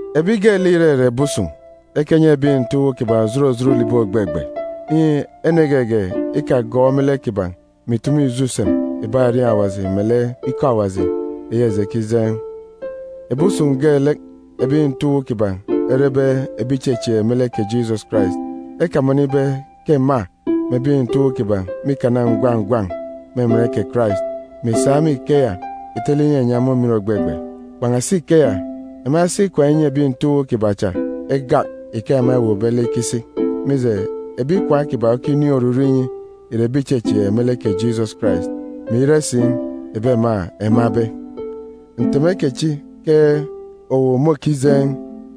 Ebi geelek ìrere ebi usun̄, ekenyi ebi nte uwu kiban̄ òjot òjot ulibi ògbegbe, inyi ene geege ikagọọk me lek kiban̄ mè ìtumu ijo usem ìbak erieen̄ Awaji melek ikọ Awaji eyi eji ekijeen̄. Ebi usun̄ geelek ebi nte uwu kiban̄ erebe ebi ìchechieek me lek kè Jisọs Karais, ekamọnọ ibe ke ema mè ebi nte uwu kiban̄ mîkana ngwan̄ ngwan̄ me emen kè Karais, mè ìsa me ikeya ìtele inyinyi ema umin ògbegbe. Kpan̄asi ikeya, ema esi ikwaan̄ enyi ebi nte uwu kiban̄ cha egak ike ema ewuukbe lek ikisi, mije, ebi ikwaan̄ kiban̄ okinin̄ oruru inyi ìre ebi ìchechieek me lek kè Jisọs Karais, mè ire si ebi ema emabe. Nteme kechi ke owu môkijeen̄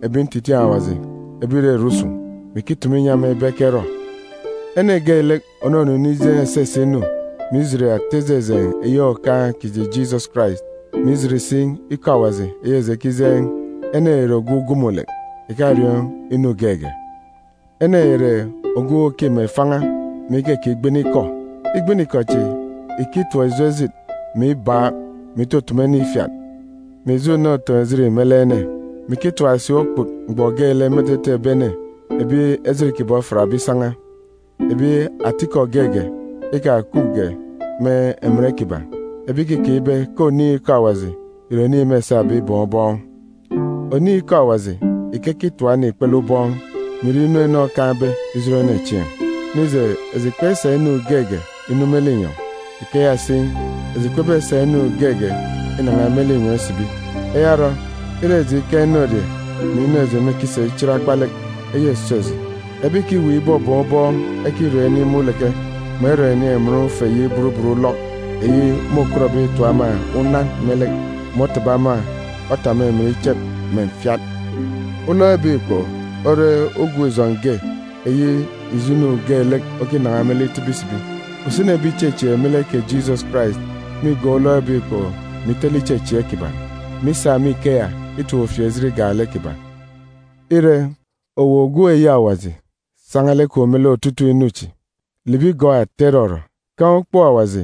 ebi ntitiin̄ Awaji ebi ìrere usun̄, mè ikitumu inyi ema ibe ekerọ. Ene geelek ònunu inijeen̄ esese inu, mè ijit ata ijejeen̄ eyi Okaan̄ kiji Jisọs Karais, mè ijit si ikọ Awaji eyi eji ekijeen̄, ene ya ìre ogwu ugumulek, ìkariọọn̄ inu geege. Ene ya ìre ogwu òkima ifan̄a mè ikekigbini ikọ. Igbini-ikọ chi ìkitap ijo ejit, mè ibaak, mè itutumu ene ifiat, mè ijo una utoon̄-ejit, me lek ene, mè ikitap si okput mgbọ geelek me etete ebi ene ebi ejit kiban̄ ofiatbe isan̄a, ebi atikọ geege ikakupge me emen kiban̄, ebi ìkikeek ibe ke oniin̄ ikọ Awaji ìre oniin̄ mêsabe ibọọn̄ ubọọn̄. Oniin̄ ikọ Awaji ìkekitap ene ikpele ubọọn̄, mè ire inu ene okaan̄be ijot ene chieen̄. Mije eji kpesa inu geege inu me linyọn̄, ikeya si, eji kpebesa inu geege inan̄a me linyọn̄ isibi. Eya orọ, ire eji ikaan̄ inorie mè inu eji mêkisa ichit akpa lek, eya îso eji. Ebi ìkiweek ibọbọọn̄ ubọọn̄ ekirọn̄ inin̄ me uleke, mè erọn̄ ènin̄ emen ufe eyi burubut ulọk, eyi môkọtbe itap ema unan me lek, mè otaba ema otap me emen ichep mè mfiat. Ulọk ebek ikpoko ore ugwun̄-ijọn̄ ge eyi ijo inu geelek okinan̄a me lek itibi isibi. Usini ebi ìchechieek me lek kè Jisọs Karais mîgọọk ulọk ebek ikpoko mè itele ichechieek kiban̄, mè isa me ikeya itap ufieejit igak lek kiban̄. Ire, owu ogwu eyi Awaji, san̄a lek kwun̄ me lek otutuuk inu chi. Libi gọọk ata irọrọ. Kaan̄ ukpook Awaji,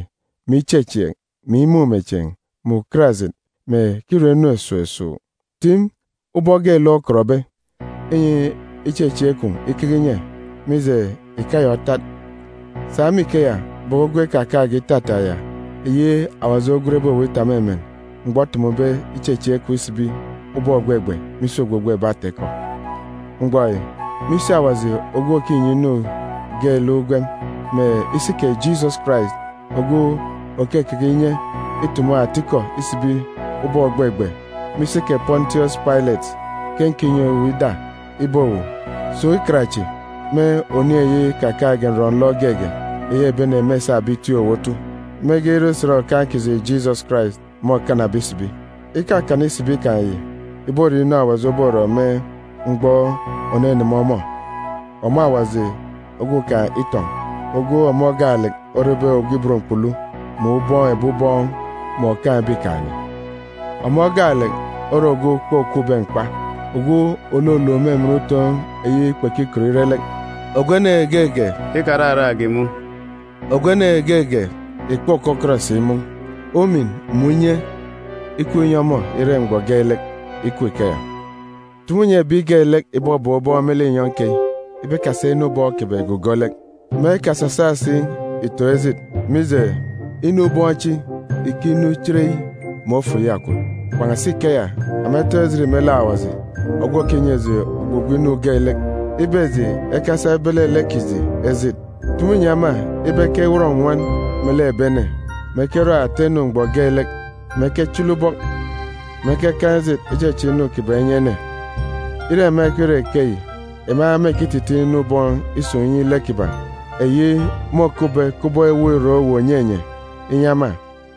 mè ichechieek, mè imumechieen̄, mè ukarajit, mè kirọ inu esuuk esuuk. Tim ubọk geelek okọtbe, inyi ichechieek kwun̄ ikeke inye, mije, ikeya otat. Sa me ikeya bọkọ ugwem ikakaan̄ge itata ya eyi Awaji ogwenbe owu itap me emen mgbọ otumube ichechieek kwun̄ isibi ubọk ògbegbe me isi ogbogbo ebi ata-ikọ. Mgbọ yi, me isi Awaji ogwu òkinyi inu geelek ugwem, mè isi kè Jisọs Karais ogwu òkekeke inye itumu atikọ isibi ubọk ògbegbe me isi kè Pọntiọs Pailet, ke nkinyi owu ida ibe owu, sun̄ ikan chi, me oniin̄ eyi ikakaan̄ge nrọ-nlọ geege eyi ebi ene mêsabe itiik owu otu, mege ire usen Okaan̄ kiji Jisọs Karais môkanabe isibi. Ikakana isibi kan̄ yi ìbore inu Awaji oborọ me mgbọ òneneme ọmọ, ọmọ Awaji ogwukaan̄ itọn̄, ogwu ọmọ gaalek orebe Ogwu Ibot Mkpulu, mè Ubọọn̄ ebi ubọọn̄, mè Òkaan̄ ebikaan̄-ene. Ọmọ gaalek ore ogwu kpokwube mkpa, ogwu òluluk me emen utoon̄ eyi kpekikọt ire lek, ogwu ene geege ìkararak ìmun̄, ogwu ene geege ìkpokọkọt si imun̄. Kè umin mè unye ikup inyi ọmọ ire mgbọ geelek! Ikup ikeya! Tumu nyi ebi geelek ìbọbọọn̄ ubọọn̄ me linyọn̄ keyi ibe ekasa inu ubọọn̄ kiban̄ ìgugo lek, mè ekasasa si ìtoon̄ ejit, mije, inu ubọọn̄ chi ìkinu chereyi, mè ofo iyakwut. Kpan̄asi ikeya, ema etoon̄ ejit me lek Awaji ogwu òkinyi eji ogbogbo inu geelek ibe eji ekesa ebele lek kiji ejit. Tumu nyi ema ibe ekenwọn nnwọn melek ebi ene, mè ekerọ ata inu mgbọ geelek, mè ekechili ubọk, mè ekekaan̄ ejit icheche inu kiban̄ inyi ene. Ire ema ikirọ ikeyi, ema mêkititiin̄ inu ubọọn̄ isun̄ inyi lek kiban̄, eyi môkupbe inyi ema kubọk ewuuk irak uwu ònyenye,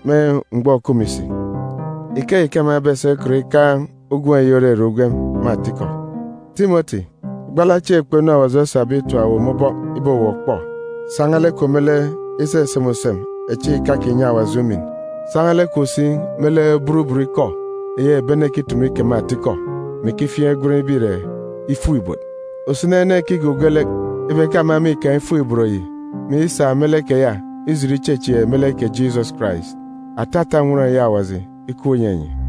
me mgbọ òkup me isi. Ikeyi ke ema ebesa ikọt ikaan̄ ugwem eyi òrere ugwem me atikọ. Timọti, gbala chieen̄ kpọ inu Awaji osabe itap owu me ubọk ibe owu òkpọ. San̄a lek kwun̄ me lek iseseme usem echi ìkakinyi Awaji umin. San̄a lek kwun̄ si me lek burubut ikọ eyi ebi ene ekitumu ikeme atikọ, mè ikifiaan̄ igwen ibe ìre “ifuk-ibot.” Usini ene ekigugo lek ibe ke ema mîkaan̄ “ifuk-ibot” yi, mè isa me lek keya ijit ichechieek me lek kè Jisọs Karais. Atata nnwọn eyi Awaji ikup inyi enyi!